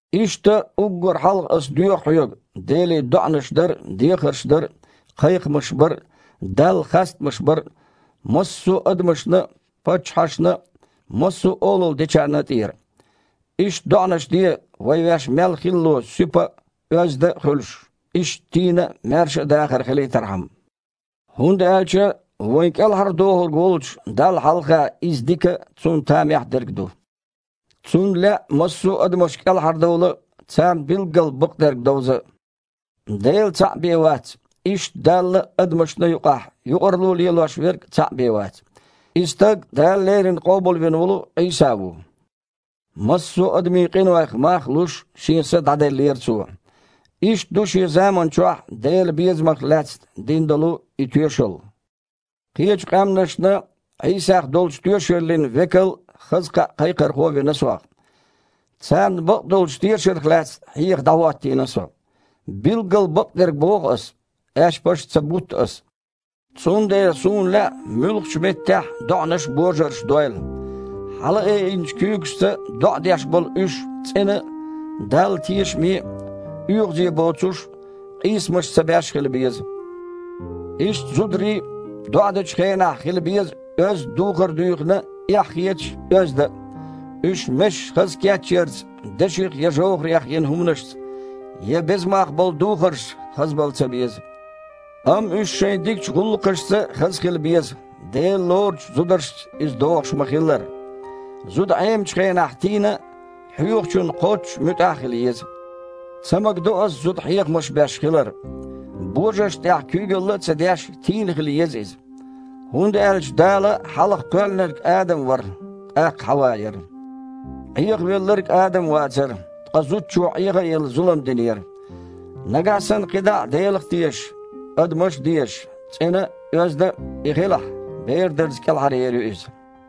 Иштта, уггар хьалха ас доьху хьоьга Деле доІанаш дар а, дехарш дар а, кхайкхамаш бар а, Далла хастамаш бар а массо а адамашна а, паччахьашна а, массо а олалла дечарна а тІера. Иштта доІанаш де, вай ваьш мел хилало суьпа а, оьзда а хуьлуш, иштта тийна а, маьрша а дахар хилийтархьама. ХІунда аьлча вайн КІелхьардохург волчу Далла хьалха иза дика а, Цунна тамехь дерг а ду. Цунна лаьа массо а адамаш кІелхьардовла а, царна билггал бакъдерг довза а. Дела цхьаъ бен вац, иштта Далла а, адамашна а юкъахь юкъарло лелош Верг а цхьаъ бен вац. И Стаг Дала леррина Къобалвина волу Іийса ву. Массо а адамийн къинойх мах а луш, Шен са дІаделлера Цо. Иштта ду шен заманчохь Делан безамах лаьцна дина долу и тоьшалла. Кхечу къаьмнашна Іийсах долчу тоьшаллина векал а, хаза кхаъ кхайкхорхо а вина сох. Царна бакъдолчу тешарх лаьцна хьеха дІахІоттийна со. Билггал бакъдерг боху ас, аьшпаш а ца бутту ас. Цундела суна лаьа муьлххачу меттехь а доІанаш божарша дойла. Хьалаайинчу куьйгашца доІа деш болу уьш цІена а, Далла тешаме а оьгІазе а боцуш, къийсамаш ца беш а хила беза. Иштта зударий а доІа дечу хенахь хила беза оьзда духар дуьйхина а, эхь хеташ а, оьзда а. Уьш месаш хаза кечъярца, деших я жовхІарех йина хІуманашца, я беза мах болу духаршца хазбала ца беза. Амма уьш шайн дикачу гІуллакхашца хаза хила беза, Дела лоручу зударшца иза догІуш ма-хиллара. Зуда Іемачу хенахь тийна а, хьоьхучунна кхоччуш муьтІахь а хила еза. Ца магадо ас зуда хьехамаш беш хилар. Божаршна тІехь куьйгалла а ца деш, тийна хила еза иза. ХІунда аьлча Дала хьалха кхоьллинарг Адам вара, тІаккха Хьава яра. Іехавелларг а Адам вацара, ткъа зудчо, Іеха а елла, зулам динера. Нагахь санна кхидІа а Делах а тешаш, адамаш а дезаш, цІена а, оьзда а и хилахь, бер дарца кІелхьаръер ю иза.